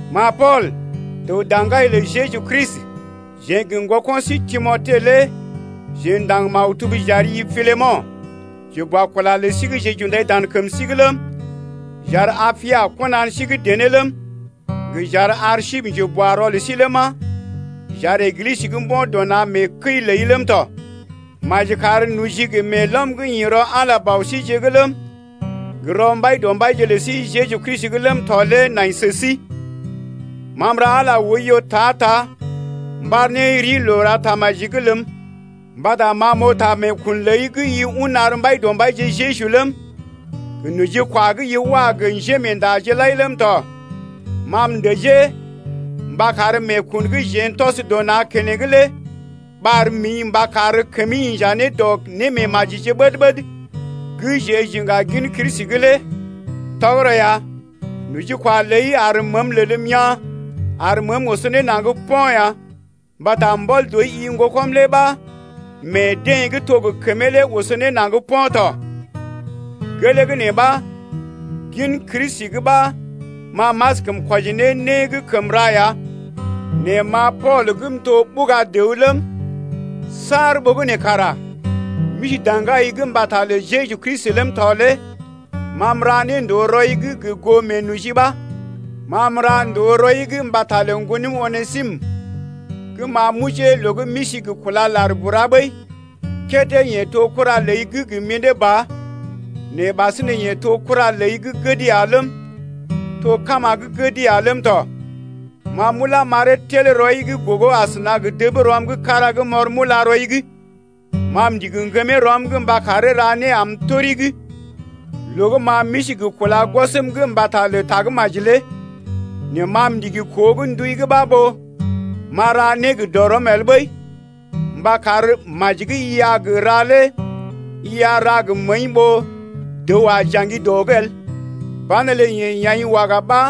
Ma Pool, dəw daŋgai lə Jeju Kristi, jeḛ gə ŋgoko̰ sí Timote lé jeḛ ndaŋg maktub j’ari-i Piləmo̰, njeboakula lə sí gə́ jeḛ j’undai dan kəm sí’g ləm, j’ar Apia kɔnan sí gə́ dené ləm, gə j’ar Arsipə njeboarɔ lə sí ləma, j’ar Eglisə gə́ mbo̰ dɔ na̰ mee kəi’g ləi ləm tɔ. Maji kar noji gə meelɔm gə́ ḭ rɔ Ala Bɔ síje’g ləm, gə rɔ Mbaidɔmbaije lə sí Jeju Kristi’g ləm tɔ lé nai sə sí. Ma m’ra Ala oiyo ta-ta m’ɓar ne rii loo ra tamaji’g ləm, mbata ma m’oo ta meekun ləi gə́ i un ar Mbaidɔmbaije Jeju ləm, gə nojikwa gə́ i wa gə njémeendaje lai ləm tɔ. Ma m’dəjee mba kar meekun gə́ jeḛ n’tɔs dɔ na̰ keneŋ lé ɓar mḭ mba kar kəmi inja ne dɔ némeemajije ɓəd-ɓəd gə́ jeḛ j’iŋga gin Kristi’g lé. Tɔgərɔ ya, nojikwa ləi ar məəm lelm yaa̰ ar məəm oso ne naŋg po̰ ya, mbata mbɔl dɔi-i ŋgokɔm lé ɓa meḛ deḛ gə́ to gə kəmee lé oso ne naŋg po̰ tɔ. Gelee gə́ nee ɓa gin Kristi’g ɓa ma m’askəm kwɔjii ne né gə́ kəm ra ya nɛ ma Pool gə́ m’to ɓuga dəw ləm, saar ɓogənè kara m’isi daŋgai’g mbata lə Jeju Kristi ləm tɔ lé ma m’ra ne ndòo rɔi’g gə goo meenoji ɓa. Ma m’randoo rɔi’g mbata lə ŋgonəm Onesimə gə́ ma m’ojee loo gə́ m’isi gə kúla lar bura ɓəi. Kédé yeḛ to kura ləi gə́ gə mḭdé ba nɛ ɓasinè yeḛ to kura ləi gə́ gəd ya ləm, to kama gə́ gəd ya ləm tɔ. Ma m’ulá m’aree tel rɔi’g gogo asəna gə dəb rɔm kára gə́ m’ɔr m’ulá rɔi’g. Ma m’ndigi ŋgəmee rɔm’g mba karee ra né am tori’g, loo gə́ ma m’isi gə kúla gwɔsm’g mbata lə Tagə́maji lé. Nɛ ma m’ndigi koo gə́ ndui’g ɓa ɓó m’a ra né gə dɔrɔm el ɓəi, mba kar maji gə́ i a gə ra lé i a ra gə məəi ɓó dəw a jaŋgi dɔ’g el. Banelə yeḛ ya̰’i waga ɓa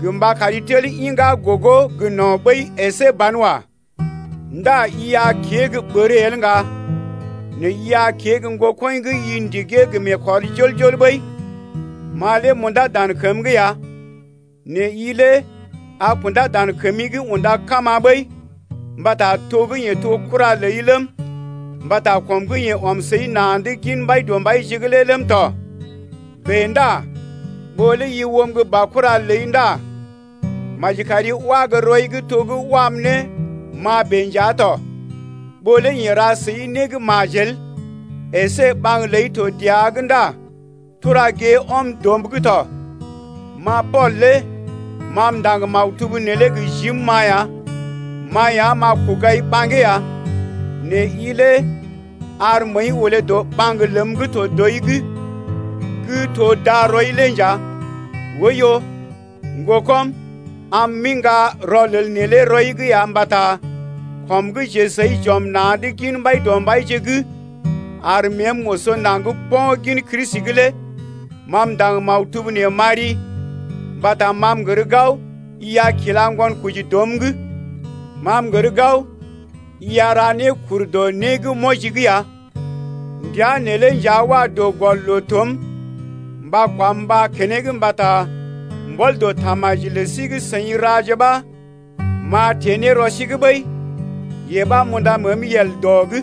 gə mba kari tel iŋgá gogo gə no̰ ɓəi əsé banwa. Ndá i a kée gə́ ɓər el ŋga nɛ i a kée gə́ ŋgokɔḭ gə́ i ndigee gə meekɔr jol-jol ɓəi. Ma lé m’undá dan kəm’g ya nɛ i lé a kundá dan kəmi’g unda kama ɓəi mbata to gə́ yeḛ to kura ləi ləm, mbata kɔm gə́ yeḛ ɔm səi na̰’d gin Mbaidɔmbaije’g lé ləm tɔ. Bèe ndá ɓó lé i oom gə́ baokura ləi ndá maji kari wá gə́ rɔi’g to gə́ wam ne ma bèe nja tɔ. Ɓó lé yeḛ ra səi né gə́ majel əsé ɓaŋg ləi to dəa’g ndá tura gée ɔm dɔm’g tɔ. Ma Pool lé ma m’ndaŋg maktub neelé gə jim-ma ya: Ma ya m’a kogai ɓaŋgee ya. Nɛ i lé ar məəi olé dɔ ɓaŋg ləm gə́ to dɔi’g gə́ to darɔi-i lé nja. Oiyo, ŋgokɔm, am m’iŋga rɔlel neelé rɔi’g ya mbata kɔm gə́ jeḛ səi j’ɔm na̰’d gin Mbaidɔmbaije’g, ar məəm oso naŋg po̰ gin Kristi’g lé. Ma m’ndaŋg maktub nee m’ari mbata ma m’gər gao i a kila ŋgonkoji dɔm’g. Ma m’gər gao i a ra né kur dɔ né gə́ m’wɔji’g ya! Ndəa neelé nja wa dɔ gɔl loo-toom mba kwam mbá keneŋ mbata mbɔl dɔ tamaji lə sí gə seḭ raje ɓa m’a teḛ ne rɔ sí’g ɓəi, yee ɓa m’unda məəm yel dɔ’g.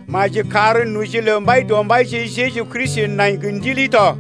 Maji kar noji lə Mbaidɔmbaije Jeju Kristi nai gə ndili tɔ.